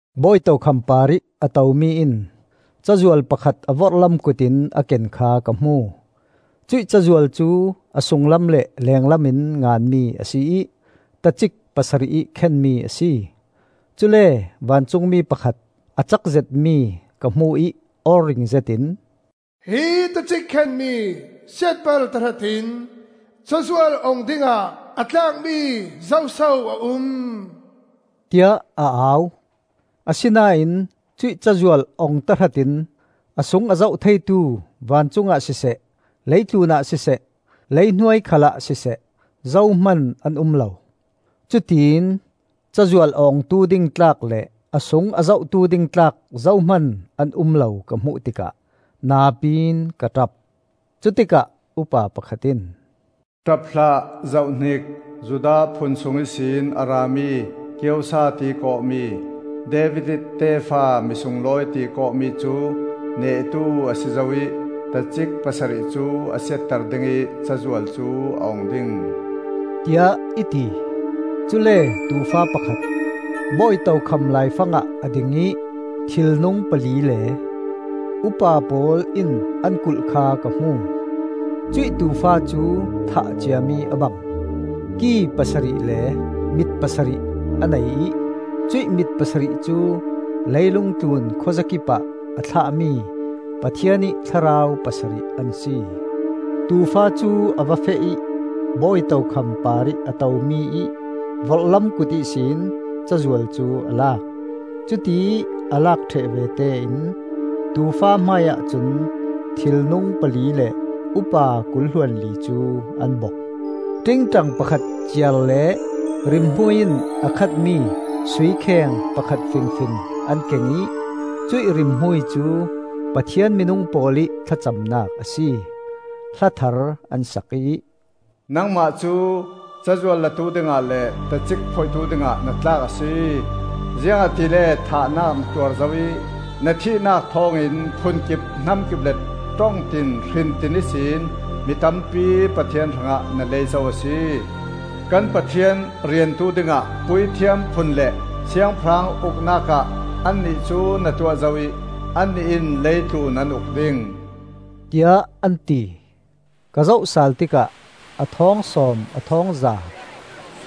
Bawi tokham parih a tomi in cazual pakhat a vorhlam kut in a ken kha ka hmu. Cuih cazual cu a sunglam le lenglam in nganmi a si ih tacik pasarih ih khenmi a si. Cule vancungmi pakhat a cak zetmi ka hmu ih aw ring zetin, “Hi tacik khenmi siatbal tahratin cazual ong dingah a tlakmi zoso a um?” tiah a au. Asinain cuih cazual ong tahratin a sung a zoh theitu vancungah siseh, leitlunah siseh, leihnuai khalah siseh, zohman an um lo. Cutiin cazual a ongtu ding tlak le a sung a zohtu ding tlak zohman an um lo ka hmuh tikah napiin ka ṭap. Cutikah upa pakhat in, “Ṭap hlah. Zohhnik! Judah phun sung ihsin a rami Kiosa tiih kawhmi, David ih tefa misunglawi tiih kawhmi cu nehtu a si zo ih tacik pasarih cu a siatter dingih cazual cu a ong ding,” tiah i ti. Cule Tuufa pakhat, bawi tokham laifangah a ding ih thilnung pali le upa pawl in an kulh kha ka hmu. Cuih Tuufa cu thah ciami a bang. Ki pasarih le mit pasarih a nei ih cuih mit pasarih cu leilung tlun khuazakip ah a thlahmi Pathian ih thlarau pasarih an si. Tuufa cu a va feh ih bawi tokham parih a tomi-ih vorhlam kut ihsin cazual cu a lak. Cutiih a lak ṭheh vete in Tuufa hmaiah cun thilnung pali le upa kul hluanli cu an bok. Ṭingṭang pakhat ciar le rimhmui in a khat mi sui kheng pakhat fingfing an keng ih cuih rimhmui cu Pathian minung pawl ih thlacamnak a si. Hla thar an sak ih: “Nangmah cu cazual latu dingah le tacik phoihtu dingah na tlak a si. Ziangahtile thahnak na tuar zo ih, na thihnak thawngin phunkip hnamkip le ṭongtin hrintin ihsin Mi tampi Pathian hrangah na lei zo a si. Kan Pathian riantu dingah puithiam phun le siangpahrang uknak ah annih cu na tuah zo ih annih in lei tlun an uk ding,” tiah an ti. Ka zoh sal tikah a thawng sawm a thawng za,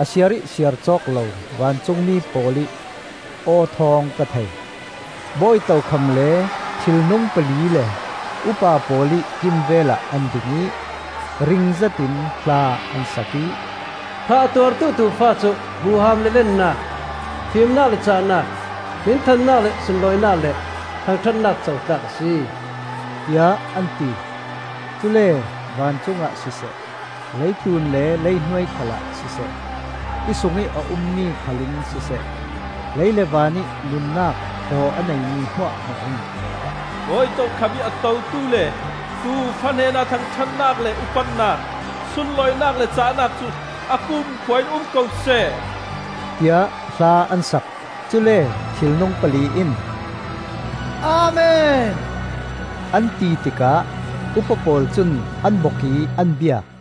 a siar ih siar cawk lo vancungmi pawl ih aw thawng ka thei. Bawi tokham le thilnung pali le upa pawl ih kimvelah an ding ih, ring zetin hla an sak ih: “Thah a tuartu Tuufa cu huham le lennak, fimnak le cahnak, Hminthannak le sunlawinak le thangṭhatnak co tlak a si,” tiah an ti. Cule vancungah siseh, leitlun le leihnuai khalah siseh, ti sungih a ummi khal in siseh, lei le van ih nunnak thaw a neimi hmuahhmuah in: “Bawi tokham ih a totu le Tuufa hnenah thangṭhatnak le upatnak, Sunlawinak le cahnak cu a kumkhua in um ko seh,” tiah hla an sak. Cule thilnung pali in, “Amen,” an ti tikah Upa pawl cun an bok ih an biak.